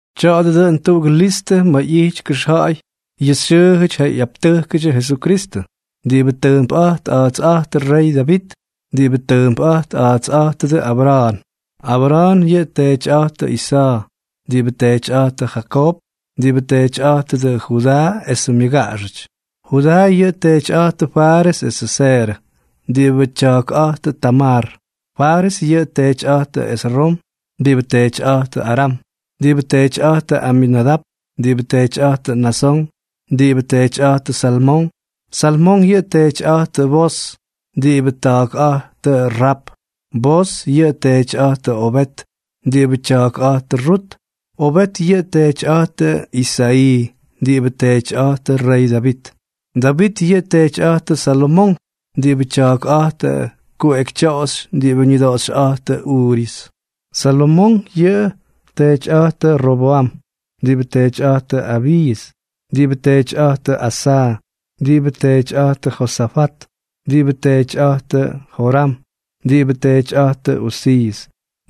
Tya̱a̱dʉ dʉꞌʉn tuꞌugʉ listʉ ma̱ ꞌyity kʉxja̱a̱y yʉ xyʉʉjʉty ja ꞌyaptʉjkʉdyʉ Jesukristʉ, diꞌibʉ tʉʉmpꞌa̱jt a̱a̱tsꞌa̱jtʉ rey Davit, diꞌibʉ tʉʉmpꞌa̱jt a̱a̱tsꞌa̱jtʉdʉ Abra̱a̱n. Abra̱a̱n yʉꞌʉ teetyꞌa̱jtʉ Isa̱a̱, diꞌibʉ teetyꞌa̱jtʉ Jakoob, diꞌibʉ teetyꞌa̱jtʉdʉ Judaa esʉ myʉgaꞌaxʉty. Judaa yʉꞌʉ teetyꞌa̱jtʉ Fares esʉ Zerʉ, diꞌibʉ tya̱a̱kꞌa̱jtʉ Tamar. Fares yʉꞌʉ teetyꞌa̱jtʉ Esrom, diꞌibʉ teetyꞌa̱jtʉ Aram, diꞌibʉ teetyꞌa̱jtʉ Aminadap, diꞌibʉ teetyꞌa̱jtʉ Naasón, diꞌibʉ teetyꞌa̱jtʉ Salmón. Salmón yʉꞌʉ teetyꞌa̱jtʉ Booz, diꞌibʉ tya̱a̱kꞌa̱jtʉ Raap. Booz yʉꞌʉ teetyꞌa̱jtʉ Obeed, diꞌibʉ tya̱a̱kꞌa̱jtʉ Rut. Obeed yʉꞌʉ teetyꞌa̱jtʉ Isa̱ꞌii, diꞌibʉ teetyꞌa̱jtʉ rey Davit. Davit yʉꞌʉ teetyꞌa̱jtʉ Salomonk, diꞌibʉ tya̱a̱kꞌa̱jtʉ kuꞌekytyoꞌoxy diꞌibʉ ñʉdoꞌoxyꞌa̱jtʉ Uriiʉs. Salomonk yʉꞌʉ teetyꞌa̱jtʉ Robwam, diꞌibʉ teetyꞌa̱jtʉ Abiiʉs, diꞌibʉ teetyꞌa̱jtʉ Asa̱a̱, diꞌibʉ teetyꞌa̱jtʉ Josafat, diꞌibʉ teetyꞌa̱jtʉ Joram, diꞌibʉ teetyꞌa̱jtʉ Uziiʉs,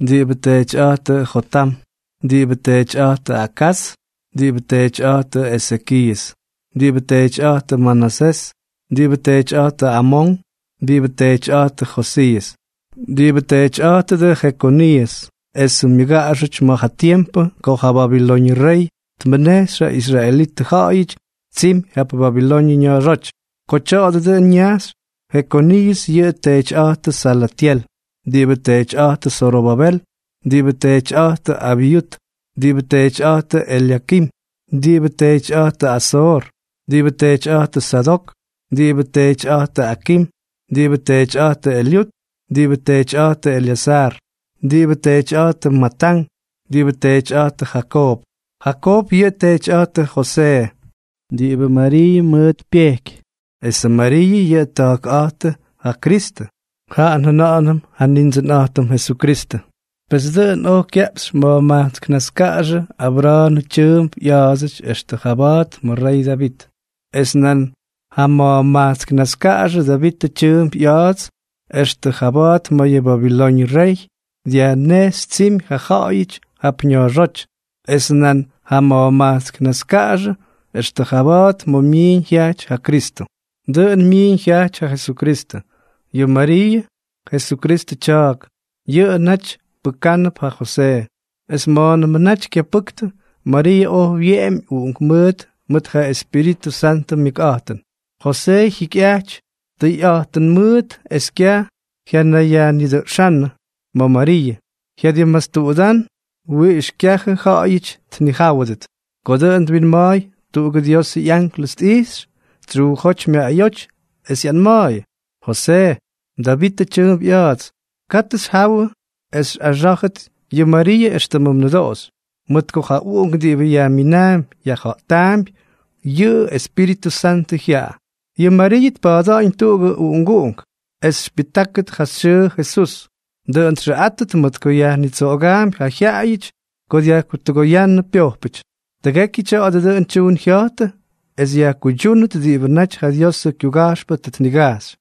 diꞌibʉ teetyꞌa̱jtʉ Jotam, diꞌibʉ teetyꞌa̱jtʉ Akaz, diꞌibʉ teetyꞌa̱jtʉ Ezekiiʉs, diꞌibʉ teetyꞌa̱jtʉ Manasés, diꞌibʉ teetyꞌa̱jtʉ Amón, diꞌibʉ teetyꞌa̱jtʉ Josiiʉs, diꞌibʉ teetyꞌa̱jtʉdʉ Jekoniiʉs esʉ myʉgaꞌaxʉty ma̱ ja tiempʉ ko ja babilóñʉdʉ rey tmʉnejxy ja israelitʉ ja̱ꞌa̱yʉty tsimy jap Babiloñʉ ña̱a̱xóty. Ko tya̱a̱dʉ dʉꞌʉn ñajxy, Jekoniiʉs yʉꞌʉ teetyꞌa̱jtʉ Salatyel, diꞌibʉ teetyꞌa̱jtʉ Zorobabel, diꞌibʉ teetyꞌa̱jtʉ Abyut, diꞌibʉ teetyꞌa̱jtʉ Elyakim, diꞌibʉ teetyꞌa̱jtʉ Azoor, diꞌibʉ teetyꞌa̱jtʉ Sadok, diꞌibʉ teetyꞌa̱jtʉ Akim, diꞌibʉ teetyꞌa̱jtʉ Elyut, diꞌibʉ teetyꞌa̱jtʉ Elyaza̱a̱r, diꞌibʉ teetyꞌa̱jtʉ Matán, diꞌibʉ teetyꞌa̱jtʉ Jakoob. Jakoob yʉꞌʉ teetyꞌa̱jtʉ Josee, diꞌibʉ Mariiʉ mʉʉt pyejky. Esʉ Mariiʉ yʉꞌʉ ta̱a̱kꞌa̱jtʉ ja Kristʉ, jaꞌa njʉna̱ꞌa̱nʉm ja Nindsʉnꞌa̱jtʉm Jesukristʉ. Pes dʉꞌʉn oj kyaꞌpxy ma̱jma̱jkts naskaꞌaxʉ Abra̱a̱nʉ tyʉʉmp ꞌya̱a̱dsʉty extʉ jaba̱a̱t ma̱ rey Davit, es nan jama̱jma̱jkts naskaꞌaxʉ Davitʉ tyʉʉmp ꞌya̱a̱dsʉty extʉ jaba̱a̱t ma̱ yʉ Babiloñʉ ryey dyajnejxy tsimy ja ja̱ꞌa̱yʉty jap ña̱a̱xóty, es nan jama̱jma̱jkts naskaꞌaxʉ extʉ jaba̱a̱t ma̱ myiiñ jyajty ja Kristʉ. Dʉꞌʉn myiiñ jyajty ja Jesukristʉ. Yʉ Mariiʉ, Jesukristʉ tya̱a̱k, yʉꞌʉ naty pʉkánʉp ja Josee. Es ma̱a̱nʉmʉ naty kyapʉktʉ, Mariiʉ oj wyeꞌemy uꞌunkmʉʉt mʉt ja Espíritʉ Santʉ myʉkꞌa̱jtʉn. Josee jyikyꞌajty tʉyꞌa̱jtʉn mʉʉt es kyaj jyanayyajnidʉꞌxánʉ ma̱ Mariiʉ, jyadimmastuꞌudán wiꞌix kyajʉ ja̱ꞌa̱yʉty tnijáwʉdʉt. Ko dʉꞌʉn twinma̱a̱y, tuꞌugʉ Diosʉ ꞌyanklʉs tꞌijxy tsyuujóty myaꞌayóty es ꞌyanma̱a̱yʉ: —Josee, Davitʉ tyʉʉmp ꞌya̱a̱ts, katʉ xyjawʉ es xyꞌaxá̱jʉt yʉ Mariiʉ éxtʉmʉ mnʉdoꞌoxy, mʉt ko ja uꞌunk diꞌibʉ yajminaampy yajja̱ꞌtaampy, yʉꞌʉ Espíritʉ Santʉ jyaꞌa. Yʉ Mariiʉ tpa̱a̱da̱ꞌa̱ñ tuꞌugʉ uꞌunguꞌunk, es xypyʉjtákʉt ja xyʉʉ Jesús. Dʉꞌʉn txʉꞌátʉt mʉt ko yajnitsoꞌogaampy ja jyaꞌayʉty ko dyajtʉgoyánnʉ pyojpʉty. Tʉgekyʉ tya̱a̱dʉ dʉꞌʉn tyuun jya̱jtʉ es yajkuydyúnʉt diꞌibʉ naty ja Diosʉ kyuga̱jxpʉ tʉ tnigajxy: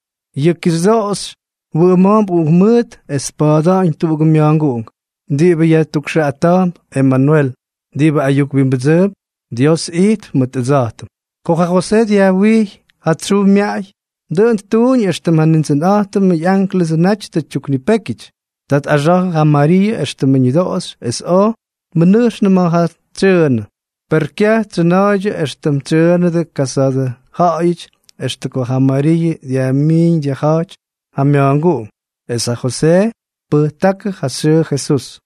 Yʉ kixyʉdoꞌoxy wʉꞌʉma̱a̱mp uꞌunkmʉʉt es tpa̱a̱da̱ꞌa̱ñ tuꞌugʉ mya̱a̱nguꞌunk diꞌibʉ yajtukxʉꞌata̱a̱mp Emanwel, diꞌibʉ ayuk wimbʉdsʉʉmp Dios ijtp mʉt ʉdsa̱jtʉm. Ko ja Josee dyajwijy ja tsyuu myaꞌay, dʉꞌʉn ttuuñ éxtʉm ja Nindsʉnꞌa̱jtʉmʉ ꞌyánklʉsʉ naty tʉ tyuknipékyʉty. Ta tꞌaxa̱jʉ ja Mariiʉ éxtʉmʉ ñʉdoꞌoxy es oj tmʉnʉjxnʉ ma̱ tsyʉʉnʉ. Per kyaj tsyʉna̱a̱ydyʉ éxtʉm tsyʉʉnʉdʉ kasa̱a̱dʉ ja̱ꞌa̱yʉty extʉ ko ja Mariiʉ dyajmiiñ dyajja̱jty ja mya̱a̱nguꞌunk. Es ja Josee tpʉjtákʉ ja xyʉʉ Jesús.